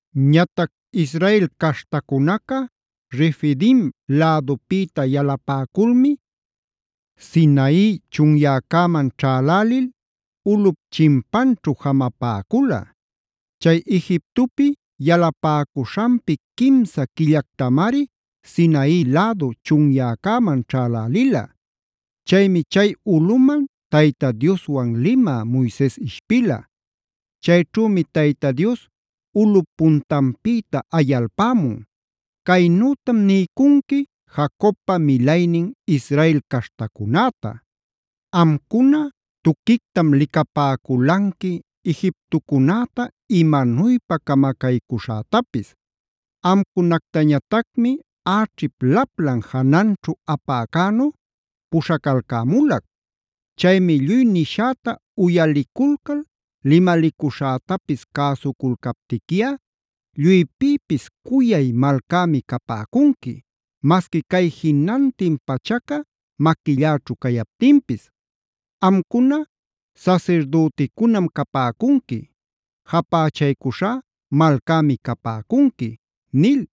Ñatac Israel caśhtacunaca Refidim lädupïta yalapäculmi Sinai chunyäcäman ćhälälil ulꞌup chinpanćhu jamapäcula. Chay Egiptopi yalapäcuśhanpi quimsa quillactamari Sinai lädu chunyäcäman ćhälälila. Chaymi chay ulꞌuman Tayta Dioswan limä Moises ishpila. Chayćhümi Tayta Dios ulꞌup puntanpïta ayalpämun: “Caynütam niycunqui Jacobpa milaynin Israel caśhtacunäta: ‘Amcuna tuquictam licapäculanqui Egiptocunäta imanuypa camacaycuśhätapis. Amcunactañatacmi äćhip laplan jananćhu apäcänu puśhacalcämulac. Chaymi lluy nishäta uyaliculcal, limalicuśhätapis cäsuculcaptiquiꞌa lluypïpis cuyay malcämi capäcunqui,a masqui cay jinantin pachaca maquilläćhu cayaptinpis. Amcuna sasirdüticunam capäcunqui;b japächaycuśhá malcämi capäcunqui’ nil.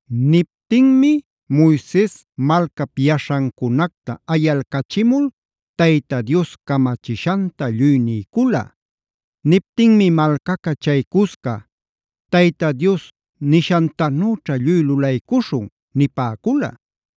Niptinmi Moises malcap yaśhancunacta ayalcachimul Tayta Dios camachishanta lluy niycula. Niptinmi malcaca chay cusca: “Tayta Dios nishantanüćha lluy lulaycuśhun” nipäcula.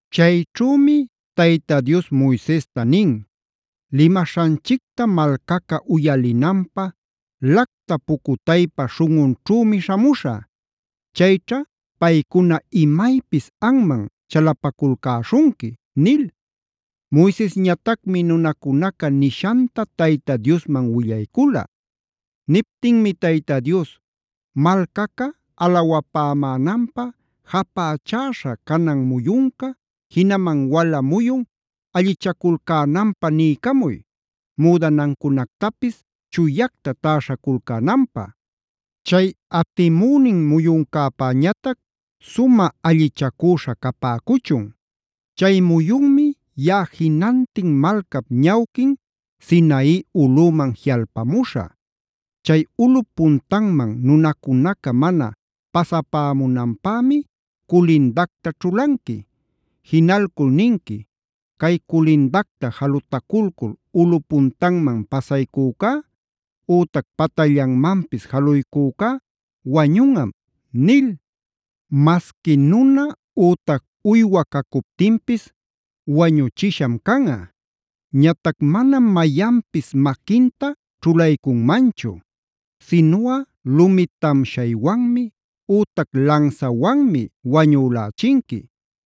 Chayćhümi Tayta Dios Moisesta nin: “Limaśhanchicta malcaca uyalinanpä lacta pucutaypa śhunꞌunćhümi śhamuśhä. Chayćha paycuna imaypis anman chalapaculcäśhunqui” nil. Moisesñatacmi nunacunaca nishanta Tayta Diosman willaycula. Niptinmi Tayta Dios: “Malcaca alawapämänanpä japächäśha canan muyunca, jinaman wala muyun allichaculcänanpä niycamuy; müdanancunactapis chuyacta täśhaculcänanpä. Chay atimünin muyuncäpäñatac sumä allichacüśha capäcuchun. Chay muyunmi yaꞌa jinantin malcap ñawquin Sinai ulꞌüman jiꞌalpamuśhä. Chay ulꞌup puntanman nunacunaca mana pasapämunanpämi culindacta ćhulanqui. Jinalcul ninqui: ‘Cay culindacta jalutaculcul ulꞌu puntanman pasaycücá ütac patallanmanpis jaluycücá wañunꞌam’ nil. Masqui nuna ütac uywa cacuptinpis wañuchisham canꞌa. Ñatac manam mayanpis maquinta ćhulaycunmanchu. Sinuꞌa lumi tamshaywanmi ütac lansawanmi wañülächinqui.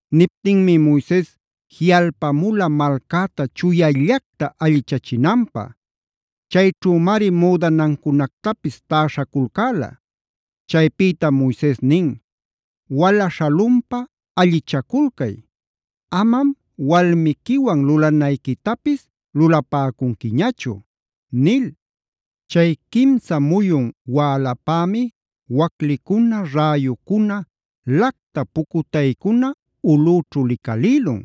Niptinmi Moises jiꞌalpamula malcäta chuyallacta allichachinanpä. Chayćhümari müdanancunactapis täśhaculcäla. Chaypïtam Moises nin: “Wala śhalunpa allichaculcay, amam walmiquiwan lulanayquitapis lulapäcunquiñachu” nil. Chay quimsa muyun wälapämi waclicuna, räyucuna,f lacta pucutaycuna ulꞌüćhu licalïlun.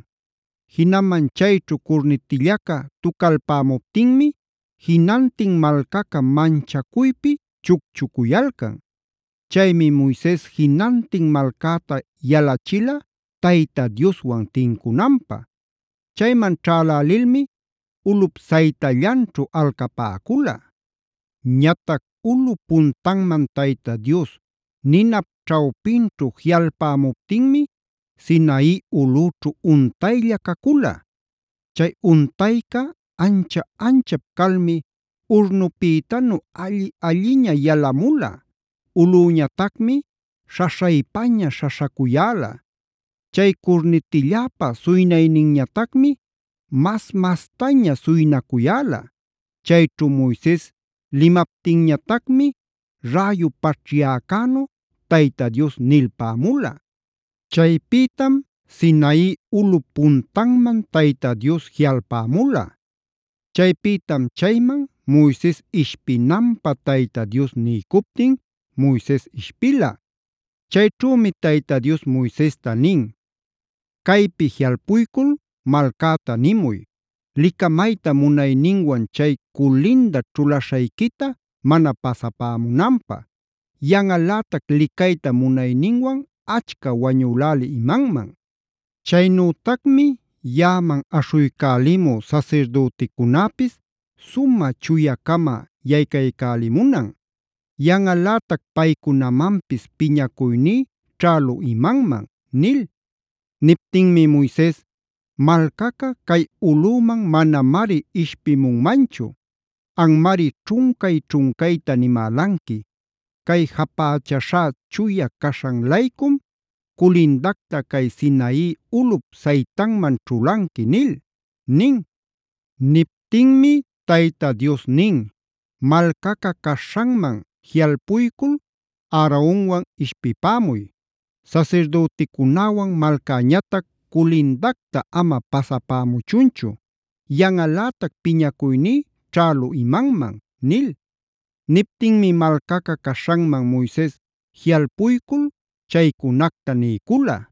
Jinaman chayćhu curnitillaca tucalpämuptinmi jinantin malcaca manchacuypi chucchucuyalcan. Chaymi Moises jinantin malcäta yalachila Tayta Dioswan tincunanpä. Chayman ćhälälilmi ulꞌup saytallanćhu alcapäcula. Ñatac ulꞌup puntanman Tayta Dios ninap ćhawpinćhu jiꞌalpämuptinmi Sinai ulꞌüćhu untaylla cacula.g Chay untayca ancha-anchap calmi urnupïtanu alli-alliña yalamula. Ulꞌüñatacmi śhaśhaypaña śhaśhacuyäla. Chay curnitilläpa suynayninñatacmi mas-mastaña suynacuyäla. Chayćhu Moises limaptinñatacmi räyu paćhyäcänu Tayta Dios nilpämula. Chaypïtam Sinai ulꞌup puntanman Tayta Dios jiꞌalpämula. Chaypïtam chayman Moises ishpinanpä Tayta Dios niycuptin Moises ishpila. Chayćhümi Tayta Dios Moisesta nin: “Caypi jiꞌalpuycul malcäta nimuy, licamayta munayninwan chay culinda ćhulaśhayquita mana pasapämunanpä. Yanꞌalätac licayta munayninwan achca wañülälï imanman. Chaynütacmi yaꞌaman aśhuycälimü sasirdüticunäpis sumä chuya-cama yaycaycälimunan. Yanꞌalätac paycunamanpis piñacuyní ćhälü imanman” nil. Niptinmi Moises: “Malcaca cay ulꞌüman manamari ishpimunmanchu; anmari ćhuncay-ćhuncayta nimälanqui: ‘Cay japächäśhá chuya caśhan-laycum, culindacta cay Sinai ulꞌup saytanman ćhulanqui’ nil” nin. Niptinmi Tayta Dios nin: “Malcaca caśhanman jiꞌalpuycul Aaronwan ishpipämuy. Sasirdüticunäwan malcäñatac culindacta ama pasapämuchunchu; yanꞌalätac piñacuyní ćhälü imanman” nil. Niptinmi malcaca caśhanman Moises jiꞌalpuycul chaycunacta niycula.